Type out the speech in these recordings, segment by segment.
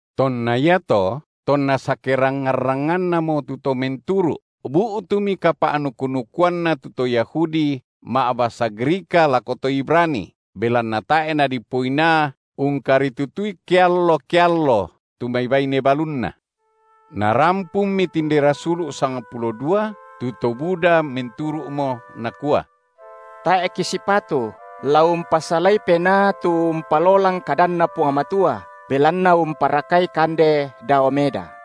Tonna iato, tonna sakerangngan-rangngannamo tu to menturu’, bu’tumi kapa’nuku-nukuanna tu to Yahudi ma’basa Grika lako to Ibrani, belanna tae’ nadipoinaa ungkaritutui keallo-keallo tu mai baine balunna. Narampunmi tinde rasulu’ sangpulo dua tu to buda menturu’mo, nakua: Tae’ kisipatu, la umpasalai penaa tu umpalolang kadanNa Puang Matua, belanna umparakai kande dao meda.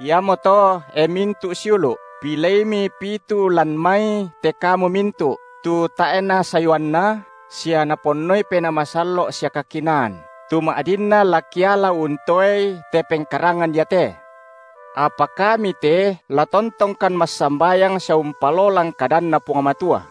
Iamoto, e mintu’ siulu’, pileimi pitu lan mai te kamu mintu’, tu tae’na sayuanna sia Naponnoi Penaa Masallo’ sia kakinaan, tu ma’dinna la kiala untoei te pengkarangan iate. Apa kami te la tontongkan massambayang sia umpalolang kadanNa Puang Matua.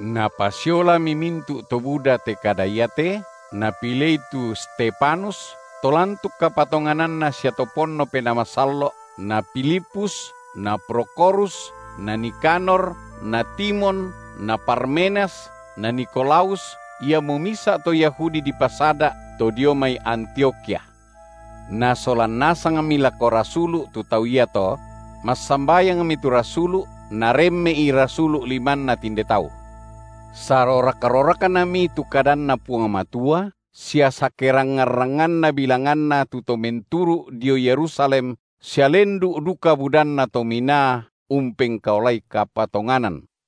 Napasiolami mintu’ to buda te kada iate, napilei tu Stefanus, to lantuk kapatongananna sia ponno Penaa Masallo’, na Filipus na Prokhorus na Nikanor na Timon na Parmenas na Nikolaus, iamo misa’ to Yahudi dipasada’, to dio mai Antiokhia. Nasolan nasangmi lako rasulu’ tu tau iato; massambayangmi tu rasulu’, naremme’i rasulu’ limanna tinde tau. Sarorak-roraknami tu kadanNa Puang Matua, sia sakerangngan-rangnganna bilanganna tu to menturu’ dio Yerusalem sia lendu’ duka budanna to minaa umpengkaolai kapatonganan.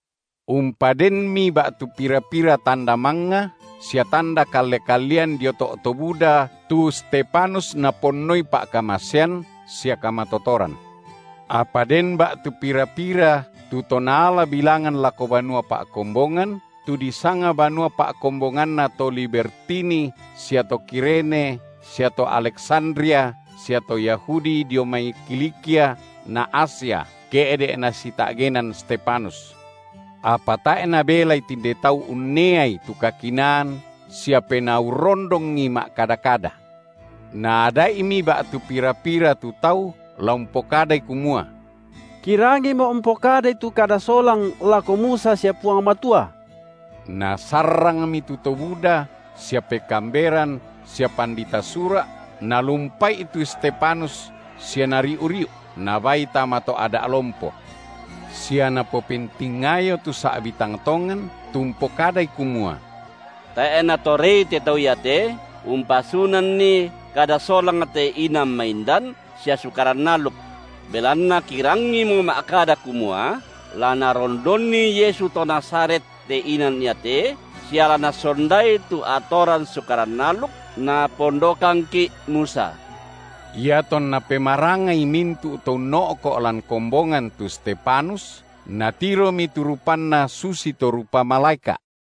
Umpadenmi ba’tu pira-pira tanda mangnga sia tanda kalle-kallean dio to’ to buda tu Stefanus naponnoi pa’kamasean sia kamatotoran. Apa den ba’tu pira-pira tu to naala bilangan lako banua pa’kombongan, tu disanga banua pa’kombonganna to Libertini sia to Kirene sia to Aleksandria sia to Yahudi dio mai Kilikia na Asia, ke’de’ nasita’genan Stefanus. Apa tae’ nabelai tinde tau unneai tu kakinaan sia Penaa urrondongi ma’kada-kada. Naada’imi ba’tu pira-pira tu tau la umpokadai kumua: Kirangimo umpokadai tu kada solang lako Musa sia Puang Matua. Nasarrangmi tu to buda sia pekaamberan sia pandita Sura’, nalumpa’i tu Stefanus sia nariu’-riu’ nabaai tama to’ Ada’ lompo. Sia napopentingayo tu sa’bi tang tongan, tu umpokadai kumua: Tae’ natorei te tau iate umpasunanni kada solang te inan maindan sia Sukaran aluk, belanna kirangimo ma’kada kumua la narondonni Yesu to Nazaret te inan iate sia la nasondai tu atoran Sukaran aluk napondokangki’ Musa. Iatonna pemarangai mintu’ to unno’ko’ lan kombongan tu Stefanus, natiromi tu rupanna susito rupa malaeka’.